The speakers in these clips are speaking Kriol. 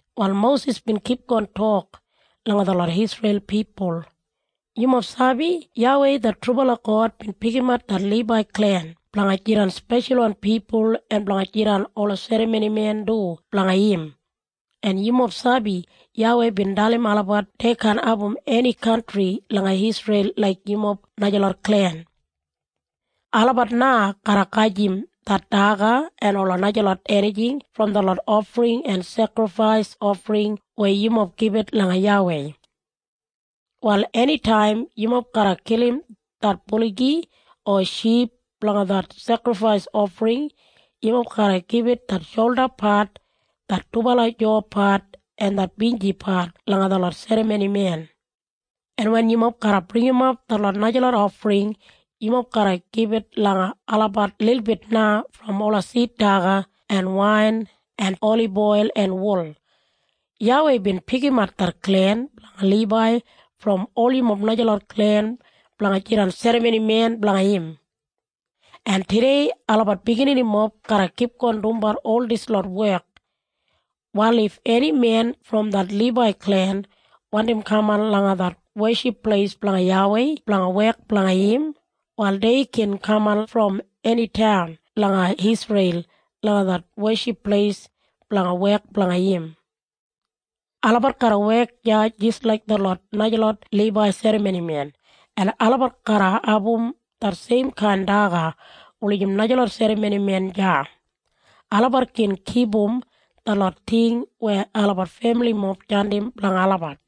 Wal Mosis bin kipgon tok langa detlot Isreil pipul, “Yumob sabi YAWEI det trubala God bin pikimat det Libai klen blanga jidan speshalwan pipul en blanga jidan ola serramonimen du blanga im. En yumob sabi YAWEI bin dalim olabat dei kaan abum eni kantri langa Isreil laik yumob najalot klen. Olabat na garra gajim det daga en ola najalot enijing brom detlot ofring en sekrifais ofring weya yumob gibit langa YAWEI. “Wal enitaim yumob garra kilim det buligi o ship blanga det sekrifais ofring, yumob garra gibit det sholdapat, det dubala jaupat en det binjipat langa detlot serramonimen. En wen yumob garra bringimap detlot najalot ofring yumob garra gibit langa olabat lilbit na brom ola sid daga en wain en oliboil en wul. YAWEI bin pikimat det klen blanga Libai brom ol yumob najalot klen blanga jidan serramonimen blanga im. En tudei olabat bigininimob garra kipgon dumbat ol dislot wek. “Wal if eni men brom det Libai klen wandim kaman langa det weship pleis blanga YAWEI blanga wek blanga im, wal dei gin kaman brom eni taun langa Isreil langa det weship pleis blanga wek blanga im. Olabat garra wek deya jis laik detlot najalot Libai serramonimen, en olabat garra abum det seimkain daga wulijim najalot serramonimen deya. Olabat gin kipum detlot ting weya olabat femilimob jandim blanga olabat.”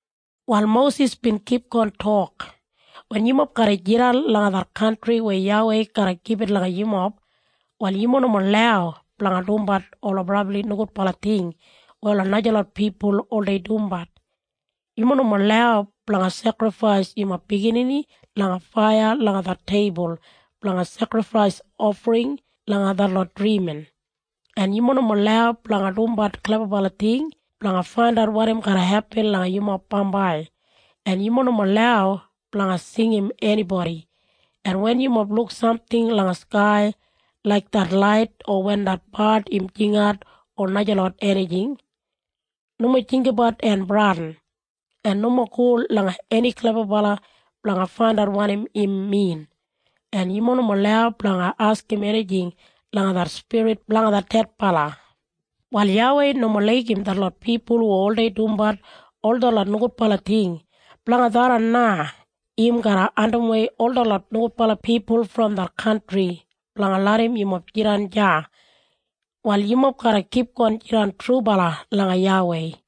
Wal Mosis bin kipgon tok, “Wen yumob garra jidan langa det kantri weya YAWEI garra gibit langa yumob, wal yumob nomo lau blanga dumbat ola brabli nogudbala ting weya ola najalot pipul oldei dumbat. Yumob nomo lau blanga sekrifais yumob biginini langa faiya langa det teibul blanga sekrifais ofring langa detlot drimin. En yumob nomo lau blanga dumbat klebabala ting blanga faindat wanim garra hepin langa yumob bambai. En yumob nomo lau blanga singim enibodi. En wen yumob luk samting langa skai laik det lait o wen det bard im jingat o najalot enijing, nomo jinggabat en bradin, en nomo go langa eni klebabala blanga faindat wanim im min. En yumob nomo lau blanga askim enijing langa det spirit blanga det dedbala. Wal YAWEI nomo laigim detlot pipul hu oldei dumbat ol detlot nogudbala ting. Blanga tharran na im garra andimwei ol detlot nogudbala pipul brom det kantri blanga larram yumob jidan deya. Wal yumob garra kipgon jidan trubala langa YAWEI.”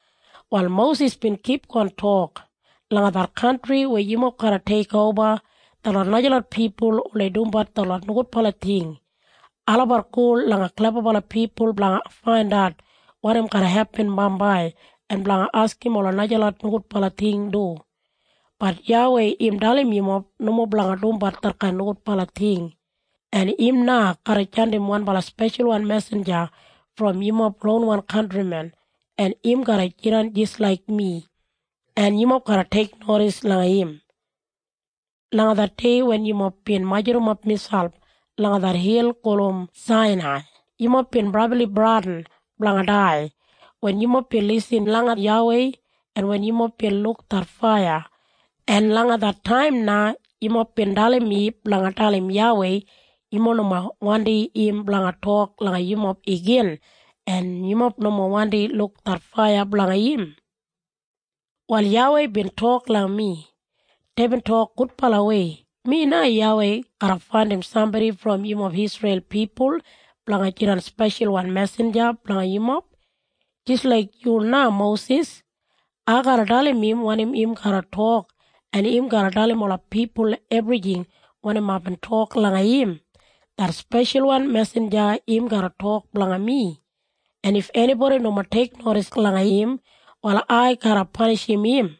Wal Mosis bin kipgon tok, “Langa det kantri weya yumob garra teikoba, detlot najalot pipul oldei dumbat detlot nogudbala ting. Olabat go langa klebabala pipul blanga faindat wanim garra hepin bambai en blanga askim ola najalot nogudbala ting du. Bat YAWEI im dalim yumob nomo blanga dumbat detkain nogudbala ting, en im na garra jandim wanbala speshalwan mesinja brom yumob ronwan kantrimen en im garra jidan jis laik mi, en yumob garra teiknodis langa im. “Langa det dei wen yumob bin majurrumap miselp langa det hil gulum Sainai yumob bin brabli bradin blanga dai wen yumob bin lisin langa YAWEI en wen yumob bin luk det faiya. En langa det taim na yumob bin dalim mi blanga dalim YAWEI yumob nomo wandi im blanga tok langa yumob igin en yumob nomo wandi luk det faiya blanga im. “Wal YAWEI bin tok langa mi, ‘Deibin tok gudbalawei. Mi na, YAWEI garra faindim sambodi brom yumob Isreil pipul blanga jidan speshalwan mesinja blanga yumob, jis laik yu na Mosis. Ai garra dalim im wanim im garra tok en im garra dalim ola pipul ebrijing wanim aibin tok langa im. Det speshalwan mesinja im garra tok blanga mi, en if enibodi nomo teiknodis langa im wal ai garra panishim im.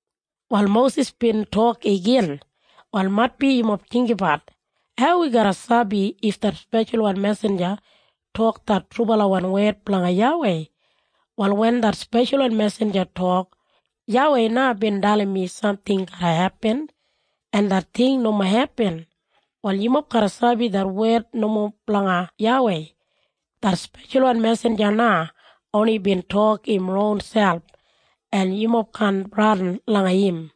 Wal Mosis bin tok igin, “Wal maitbi yumob jinggabat, ‘Hau wi garra sabi if det speshalwan mesinja tok det trubalawan wed blanga YAWEI?’ Wal wen det speshalwan mesinja tok, ‘YAWEI na bin dalim mi samting garra hepin,’ en det ting nomo hepin, wal yumob garra sabi det wed nomo blanga YAWEI. Det speshalwan mesinja na oni bin tok im ronselp, en yumob kaan bradin langa im.”